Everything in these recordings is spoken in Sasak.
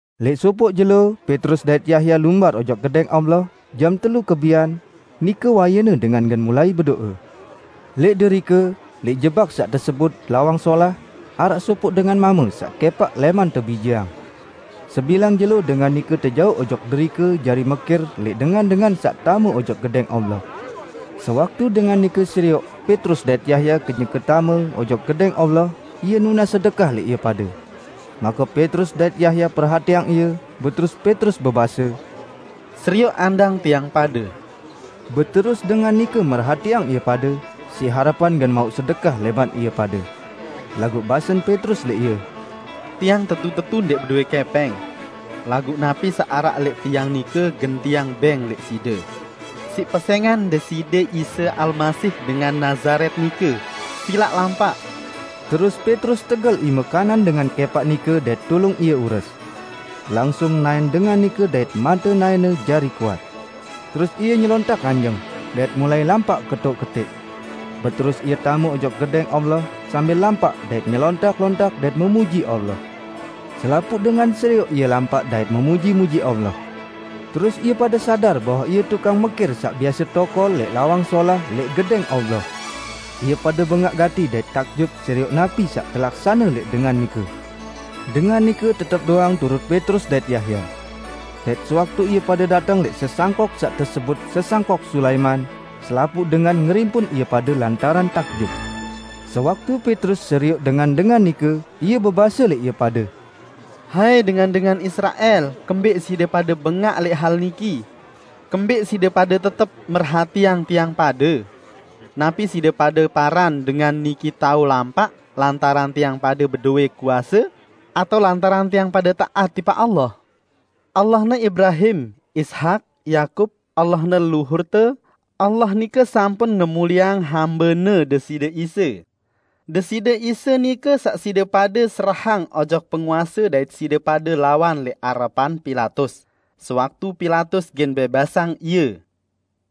Lẽq sopoq jelo Petrus dait Yahya lumbar ojok Gedẽng Allah jam telu kebian, nike wayene dengan gen mulai bedo'e. Lẽq derike, lẽq jebak saq tesebut, "Lawang Solah", araq sopoq dengan mame saq kẽpaq lẽman tebijeang. Sebilang jelo dengan nike tejauq ojok derike jari mekir lẽq dengan-dengan saq tame ojok Gedẽng Allah. Sewaktu dengan nike serioq Petrus dait Yahya kenyeke tame ojok Gedẽng Allah, ie nunas sedekah lẽq ie pade. Make Petrus dait Yahya perhatiang ie, beterus Petrus bebase, "Serioq andang tiang pade!" Beterus dengan nike merhatiang ie pade, siq harepan gen mauq sedekah lẽman ie pade. Laguq basen Petrus lẽq ie, "Tiang tetu-tetu ndẽq bedowẽ kẽpẽng. Laguq napi saq araq lẽq tiang nike gen tiang bẽng lẽq side: Siq pesẽngan Deside Isa Almasih dengan Nazaret nike, silaq lampaq!" Terus Petrus tegel ime kanan dengan kẽpaq nike dait tulung ie ures. Langsung naẽn dengan nike dait mate naẽne jari kuat. Terus ie nyelontak nganjeng, dait mulai lampaq ketoq-ketẽq. Beterus ie tame ojok Gedẽng Allah, sambil lampaq dait nyelontak-lontak dait memuji Allah. Selapuq dengan serioq ie lampaq dait memuji-muji Allah. Terus ie pade sadar bahwe ie tukang mekir saq biase tokol lẽq "Lawang Solah" lẽq Gedẽng Allah. Ie pade bengaq gati dait takjub serioq napi saq telaksane lẽq dengan nike. Dengan nike tetep doang turut Petrus dait Yahya. Dait sewaktu ie pade dateng lẽq sesangkok saq tesebut "Sesangkok Sulaiman", selapuq dengan ngerimpun ie pade lantaran takjub. Sewaktu Petrus serioq dengan-dengan nike, ie bebase lẽq ie pade, "Hai dengan-dengan Israel, kembẽq side pade bengaq lẽq hal niki? Kembẽq side pade tetep merhatiang tiang pade? Napi side pade paran dengan niki tao lampaq lantaran tiang pade bedowẽ kuase, atao lantaran tiang pade taat tipaq Allah? Allahne Ibrahim, Ishak, Yakub, Allahne leluhurte, Allah nike sampun ngemulieang Hambe-Ne, Deside Isa. Deside Isa nike saq side pade serahang ojok penguase dait side pade lawan lẽq arepan Pilatus, sewaktu Pilatus gen bẽbasang Ie.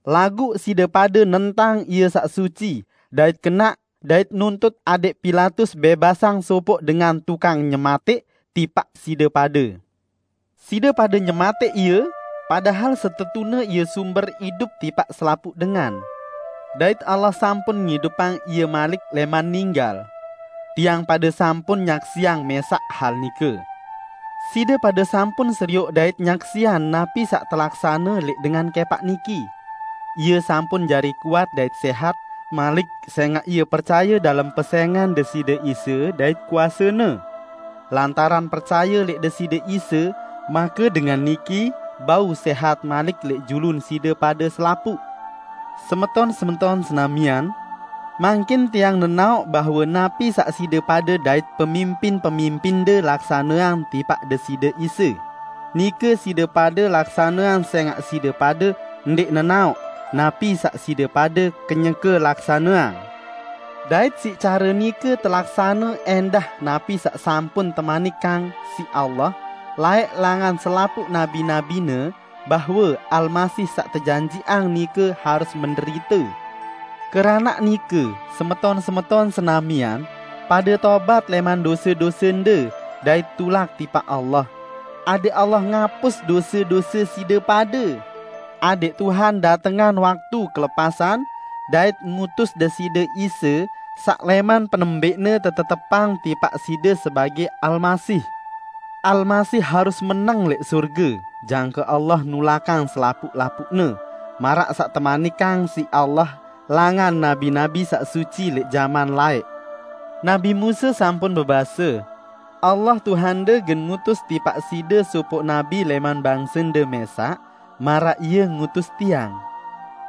Laguq side pade nentang Ie Saq Suci dait Kenaq dait nuntut adẽq Pilatus bẽbasang sopoq dengan tukang nyematẽq tipaq side pade. Side pade nyematẽq Ie, padahal setetune Ie sumber idup tipaq selapuq dengan. Dait Allah sampun ngidupang Ie malik lẽman ninggal. Tiang pade sampun nyaksiang mẽsaq hal nike. Side pade sampun serioq dait nyaksiang napi saq telaksane lẽq dengan kẽpaq niki. Ie sampun jari kuat dait sẽhat malik sẽngaq ie percaye dalem pesẽngan Deside Isa dait kuase-Ne. Lantaran percaye lẽq Deside Isa make dengan niki bau sẽhat malik lẽq julun side pade selapuq. Semeton-semeton senamian! Mangkin tiang nenaoq bahwe napi saq side pade dait pemimpin-pemimpinde laksaneang tipaq Deside Isa, nike side pade laksaneang sẽngaq side pade ndẽq nenaoq napi saq side pade kenyeke laksaneang. Dait siq care nike telaksane ẽndah napi saq sampun temanikang siq Allah laẽq langan selapuq nabi-nabi-Ne, bahwe Almasih saq tejanjiqang nike harus menderite. Keranaq nike, semeton-semeton senamian, pade tobat lẽman dose-dosende dait tulak tipaq Allah, adẽq Allah ngapus dose-dose side pade, adẽq Tuhan datengang waktu kelepasan, dait ngutus Deside Isa, saq lẽman penembẽqne tetetepang tipaq side sebagẽ Almasih. Almasih harus meneng lẽq sorge jangke Allah nulakang selapuq-lapuqne, maraq saq temanikang siq Allah langan nabi-nabi saq suci lẽq jaman laẽq. Nabi Musa sampun bebase, 'Allah, Tuhande gen ngutus tipaq side sopoq nabi lẽman bangsende mẽsaq, maraq Ie ngutus tiang.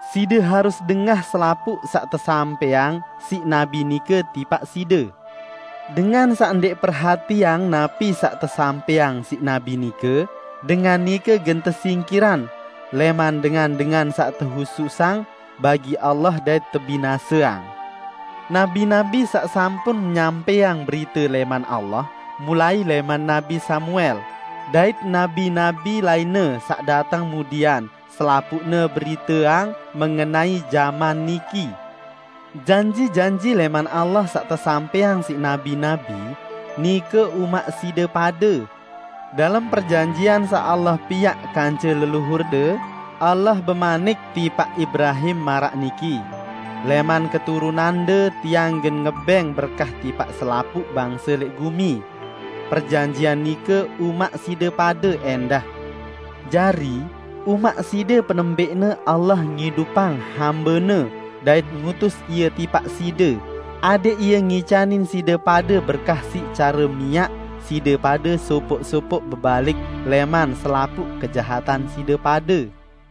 Side harus dengah selapuq saq tesampẽang siq nabi nike tipaq side. Dengan saq ndẽq perhatiang napi saq tesampẽang siq nabi nike, dengan nike gen tesingkirang lẽman dengan-dengan saq tehususang bagi Allah dait tebinaseang.' Nabi-nabi saq sampun nyampẽang berite lẽman Allah, mulai lẽman nabi Samuel, dait nabi-nabi lainne saq dateng mudian, selapuqne beriteang mengenai jaman niki. Janji-janji lẽman Allah saq tesampẽang siq nabi-nabi, nike umaq side pade. Dalem perjanjian saq Allah piaq kance leluhurde, Allah bemanik tipaq Ibrahim maraq niki, 'Lẽman keturunande Tiang gen ngebẽng berkah tipaq selapuq bangse lẽq gumi.' Perjanjian nike umaq side pade ẽndah. Jari, umaq side penembẽqne Allah ngidupang Hambe-Ne dait ngutus Ie tipaq side, adẽq Ie ngicanin side pade berkah siq care miaq side pade sopoq-sopoq bebalik lẽman selapuq kejahatan side pade."